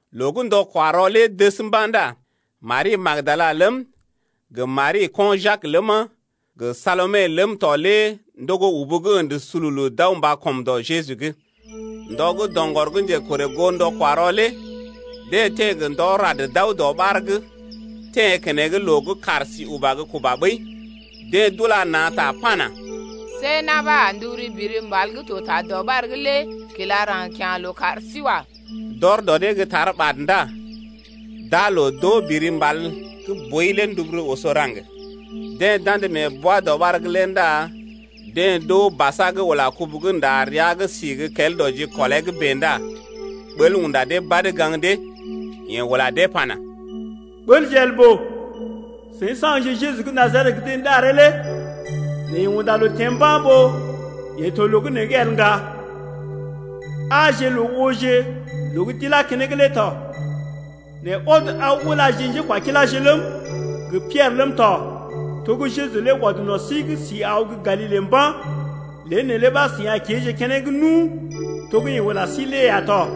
Loo gə́ ndɔ-kwa-rɔ lé dəs mba̰ ndá Mari gə́ Magdala ləm, gə Mari gə́ ko̰ Jak ləma, gə Salome ləm tɔ lé ndogo ubu gə́ ə̰də sululu d’aw mba kɔm dɔ Jeju’g. Ndɔ gə́ doŋgɔr gə́ njekorè goo ndɔ-kwa-rɔ lé deḛ teḛ gə́ ndɔ rad d’aw dɔɓar’g, teḛ keneŋ loo gə́ kàr si uba gə́ kuba ɓəi. Deḛ d’ula na̰ ta pana: See na̰ ɓa a nduburu biri mbal gə́ to ta dɔɓar’g lé kilá raŋg kya̰ loo kar sí wa. D’ɔr dɔ dee gə́ tar ɓad ndá d’aa loo d’oo biri mbal gə́ boi lé nduburu oso raŋg. Deḛ d’andə mee bwa-dɔɓar’g lé ndá deḛ d’oo basa gə́ ula kubu gə́ nda rəa’g sí gə kel dɔ jikɔlee’g bèe ndá ɓəl unda dee badə gaŋg dee. Yeḛ ula dee pana: Ɓəlje el ɓòo, seḭ saŋgje Jeju gə́ Najaret gə́ deḛ ɗaree lé, nɛ yeḛ unda loo teḛ mba̰ ɓó yeḛ to loo gə́ nee’g el ŋga: aaje loo ooje loo gə́ d’ilá keneŋ lé tɔ. Nɛ ɔd aw ulaje njékwakiláje ləm, gə Piɛrə ləm tɔ to gə́ Jeju lé ɔd no̰ sí’g sí aw gə́ Galile mba̰, lé neelé ɓa seḭ a kéeje keneŋ nu to gə́ yeḛ ula sí lé ya tɔ.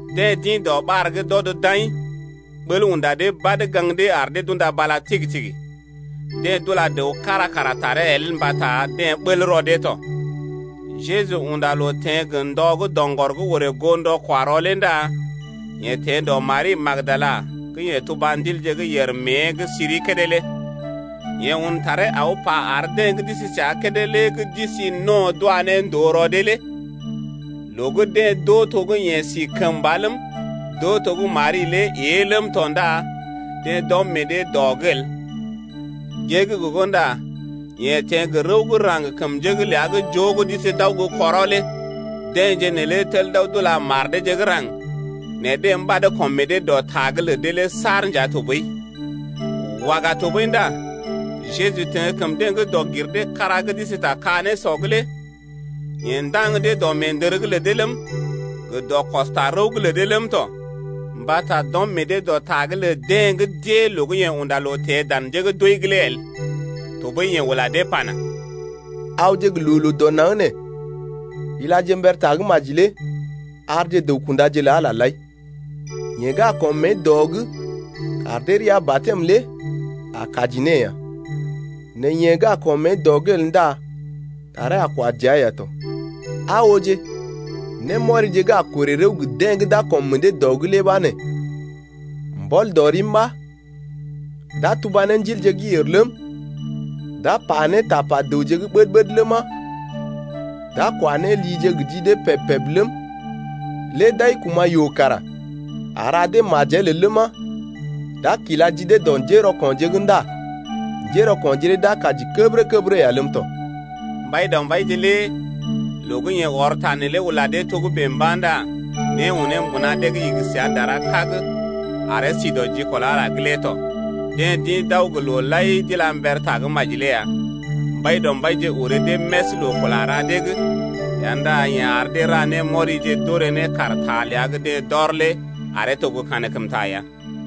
Deḛ d’ḭ dɔɓar’g d’ɔd d’aḭ. Ɓəl unda dee badə gaŋg dee ar dee d’unda bala tigi-tigi. Deḛ d’ula dəw kára kara taree el mbata deḛ ɓəl rɔ dee tɔ. Jeju unda loo teḛ gə ndɔ gə́ doŋgɔr gə́ orè goo ndɔ-kwa-rɔ lé ndá yeḛ teḛ dɔ Mari gə́ Magdala gə́ yeḛ tuba ndilje gə́ yèr mée’g siri kédé lé. Yeḛ un taree aw pa ar deḛ gə́ d’isi səa kédé lé gə́ d’isi no̰ d’wa ne ndòo rɔ dee lé. Loo gə́ deḛ d’oo to gə́ yeḛ si kəmba ləm, d’oo to gə́ Mari lé ée ləm tɔ ndá deḛ d’ɔm meḛ dee dɔ’g el. Gée’g gogo ndá yeḛ teḛ gə rəw gə́ raŋg kəm njé’g ləa gə́ joo gə́ d’isi d’aw gə́ kɔrɔ lé. Deḛje neelé tel d’aw d’ula mar deeje gə́ raŋg, nɛ deḛ mbad kɔm meḛ dee dɔ ta’g lə dee lé saar nja tɔɓəi. Waga tɔɓəi ndá Jeju teḛ kəm deḛ gə́ dɔg-gir-dee-kára gə́ d’isi ta ka-nésɔ’g lé, yeḛ ndaŋg dee dɔ meendər’g lə dee ləm, gə dɔ kɔstarəw’g lə dee ləm tɔ, mbata d’ɔm meḛ dee dɔ ta’g lə deḛ gə́ d’ée loo gə́ yeḛ unda loo teḛ dan njé gə́ d’wəi’g lé el. Tɔɓəi yeḛ ula dee pana, awje gə loo-loo dɔ naŋg nee ilaje mber tagə́maji lé arje dəw-kundaje lə Ala lé lai. Yeḛ gə́ a kɔm mée dɔ’g kar dee rəa batɛm lé a kaji ne ya, nɛ yeḛ gə́ a kɔm mée dɔ’g el ndá taree a kwa dəa ya tɔ. Aa ooje, némɔrije gə́ a korè rəw gə deḛ gə́ d’a kɔm meḛ dee dɔ’g lé ɓa nee: Mbɔl dɔ rim ɓa d’a tuba ne ndilje gə́ yèr ləm, d’a pa ne tapa dəwje gə́ ɓəd-ɓəd ləma, d’a kwa ne lije gə ji dee peb-peb ləm, lé d’ai kuma̰ yoo lé a ra dee majel el ləma, d’a kila ji dee dɔ njérɔko̰je’g ndá njérɔko̰je lé d’a kaji kəbərə-kəbərə ya ləm tɔ. Mbaidɔmbaije lé loo gə́ yeḛ ɔr ta neelé ula dee togə́bè mba̰ ndá né unee mbuna dee’g igi səa dara kag aree si dɔ jikɔl Ala’g tɔ. Deḛ d’ḭ d’aw gə loo lai d’ila mber tagə́maji lé ya. Mbaidɔmbaije orè dee més loo kula ra dee’g ya ndá yeḛ ar dee ra némɔrije d’orè ne kaar ta ləa gə́ deḛ d’ɔr lé aree to gə́ kankəmta ya.